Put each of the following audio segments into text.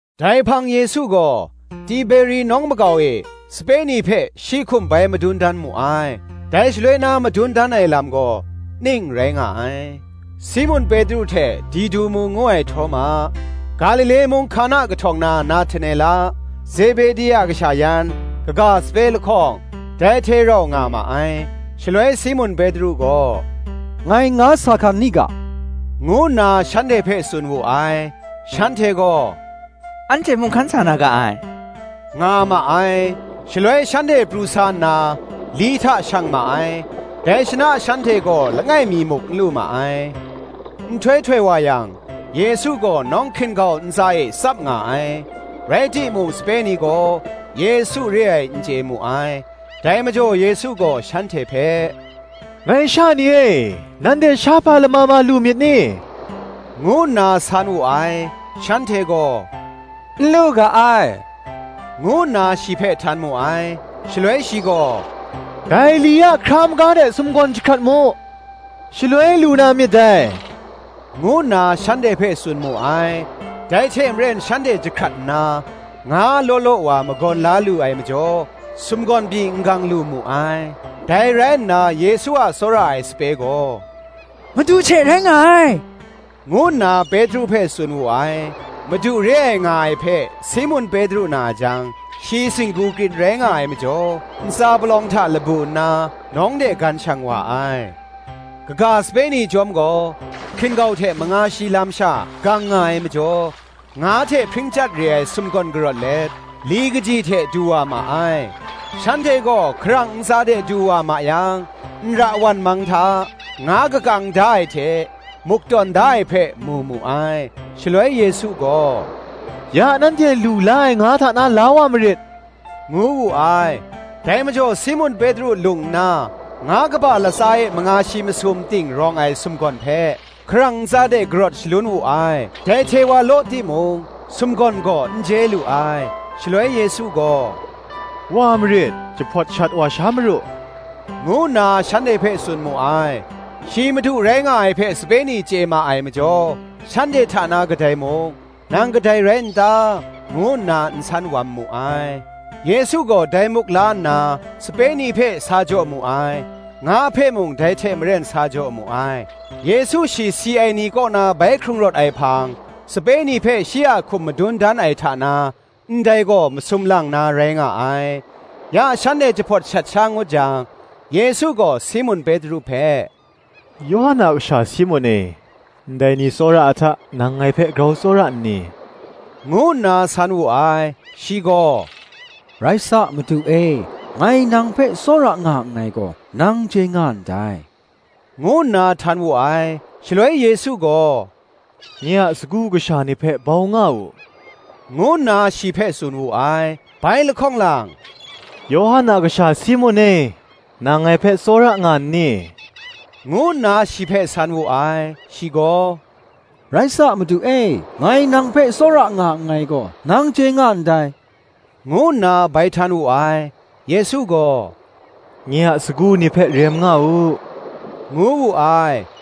Dai hpang Yesu gaw Tiberi nawng makau e, sape ni hpe shi hkum bai madun dan mu ai; dai shaloi na madun dan ai lam gaw, ning rai nga ai: Simun Petru hte Didumu ngu ai Htawma, Galile mung Hkana kahtawng na Nahtanela, Zebedi a kasha yan, kaga sape lahkawng, dai hte rau nga ma ai. Shaloi Simun Petru gaw, “Ngai nga sa hkan ni ga,” ngu nna shanhte hpe tsun wu ai. Shanhte gaw, “Anhte mung hkan sa na ga ai,” nga ma ai. Shaloi shanhte pru sa nna li hta shang ma ai: dai shana shanhte gaw langai mi muk n lu ma ai. Nhtoi htoi wa yang, Yesu gaw nawng hkin-gau ntsa e tsap nga ai: rai timung sape ni gaw, Yesu re ai, n chye mu ai. Dai majaw Yesu gaw shanhte hpe, “Ngai sha ni e, nanhte shahpa lama ma lu myit ni?” ngu nna san wu ai; shanhte gaw, “N lu ga ai,” ngu nna shi hpe htan mu ai. Shaloi shi gaw, “Dai li a hkra maga de sumgawn jahkrat mu, shaloi lu na myit dai,” ngu nna shanhte hpe tsun mu ai. Dai hte maren shanhte jahkrat nna, nga law law wa magawn la lu ai majaw, sumgawn pyi n gang lu mu ai. Dai rai nna Yesu a tsawra ai sape gaw, “Madu she rai nga ai,” ngu nna Petru hpe tsun wu ai. Madu re ai nga ai hpe Simun Petru na jang, shi singgu krin rai nga ai majaw, ntsa palawng hta labu nna, nawng de gan shang wa ai. Kaga sape ni chyawm gaw, hkin-gau hte manga shi lam sha gang nga ai majaw, nga hte hpring chyat re ai sumgawn karawt let, li kaji hte du wa ma ai. Shanhte gaw hkarang ntsa de du wa ma yang, nra wan mang hta, nga kakang da ai hte, muk tawn da ai hpe, mu mu ai. Shaloi Yesu gaw, “Ya nanhte lu la ai nga hta na la wa marit,” ngu wu ai. Dai majaw Simun Petru lung nna, nga kaba latsa e manga shi masum ting rawng ai sumgawn hpe hkarang ntsa de karawt shalun wu ai: dai hte wa law timung, sumgawn gaw n je lu ai. Shaloi Yesu gaw, “wa marit, jahpawt shat wa sha maru,” ngu nna shanhte hpe tsun mu ai. Shi Madu rai nga ai hpe sape ni chye ma ai majaw, shanhte hta na kadai mung, “Nang kadai rai n ta?” ngu nna n san wam mu ai. Yesu gaw dai muk la nna sape ni hpe sa jaw mu ai; nga hpe mung dai hte maren sa jaw mu ai. Yesu shi si ai ni kaw na bai hkrung rawt ai hpang, sape ni hpe shi a hkum madun dan ai hta na, ndai gaw masum lang na rai nga ai. Ya shanhte jahpawt shat sha ngut jang, Yesu gaw Simun Petru hpe, “Yawhan a kasha Simun e, ndai ni tsawra ai hta, nang ngai hpe grau tsawra nni?” ngu nna san wu ai. Shi gaw, “Rai sa, Madu e, ngai nang hpe tsawra nga nngai gaw, nang chye nga ndai,” ngu nna htan wu ai. Shaloi Yesu gaw, “Nye a sagu kasha ni hpe bau nga u,” ngu nna shi hpe tsun wu ai. Bai lahkawng lang, “Yawhan a kasha Simun e, nang ngai hpe tsawra nga nni?” ngu nna shi hpe san wu ai. Shi gaw, “Rai sa, Madu e, ngai nang hpe tsawra nga nngai gaw, nang chye nga ndai,” ngu nna bai htan wu ai. Yesu gaw, “Nye a sagu ni hpe rem nga u,” ngu wu ai.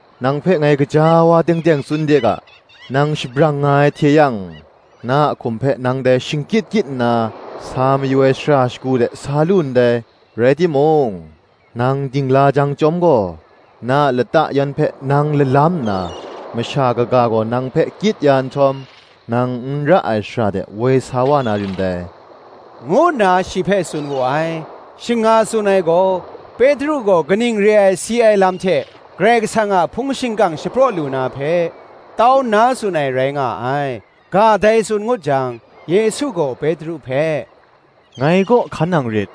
Nang hpe ngai gaja wa teng teng tsun de ga, Nang shabrang nga ai hte yang, na a hkum hpe nang dai shingkyit kyit nna, sa mayu ai shara shagu de sa lu ndai: rai timung, nang dingla jang chyawm gaw, na a lata yan hpe nang lalam nna, masha kaga gaw nang hpe kyit ya nhtawm, nang n ra ai shara de woi sa wa na rin dai,” ngu nna shi hpe tsun wu ai. Shing nga tsun ai gaw, Petru gaw kaning re ai si lam hte Karai Kasang a hpung shingkang shapraw lu na hpe, tau nna tsun ai rai nga ai. Ga dai tsun ngut jang, Yesu gaw Petru hpe, “Ngai kaw hkan nang rit,”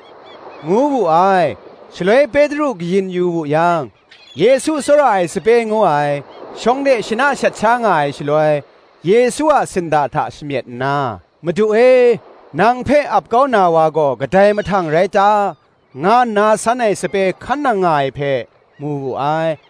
ngu wu ai. Shaloi Petru kayin yu wu yang, Yesu tsawra ai sape ngu ai, shawng de shana shat sha nga ai shaloi, Yesu a sinda hta shamyet nna, “Madu e, nang hpe ap kau na wa gaw kadai mahtang rai ta?” nga nna san ai sape hkan nang nga ai hpe, mu wu ai.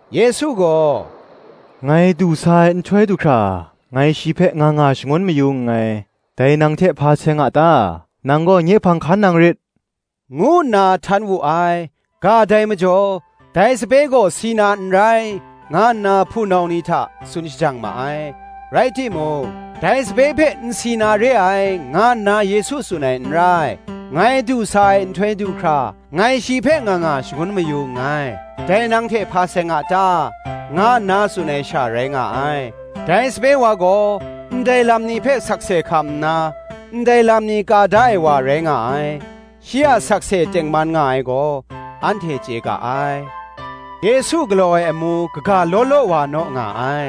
Yesu gaw, “Ngai du sa ai nhtoi du hkra, ngai shi hpe nga nga shangun mayu nngai, dai nang hte hpa seng a ta? nang gaw nye hpang hkan nang rit,” ngu nna htan wu ai. Ga dai majaw, dai sape gaw si na n rai, nga nna hpunau ni hta tsun shajang ma ai: rai timung, dai sape hpe n si na re ai, nga nna Yesu tsun ai n rai; “Ngai du sa ai nhtoi du hkra, ngai shi hpe nga nga shangun mayu nngai, dai nang hte hpa seng a ta?” nga nna tsun ai sha, rai nga ai. Dai sape wa gaw ndai lam ni hpe sakse hkam nna, ndai lam ni ka da ai wa rai nga ai: shi a sakse tengman nga ai gaw, anhte chye ga ai. Yesu galaw ai amu kaga law law wa naw nga ai;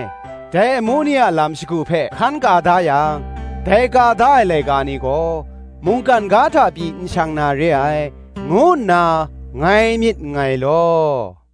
dai amu ni a lam shagu hpe hkan ka da yang, dai ka da ai laika ni gaw mungkan ga hta pyi n shang na re ai, ngu nna ngai myit nngai law.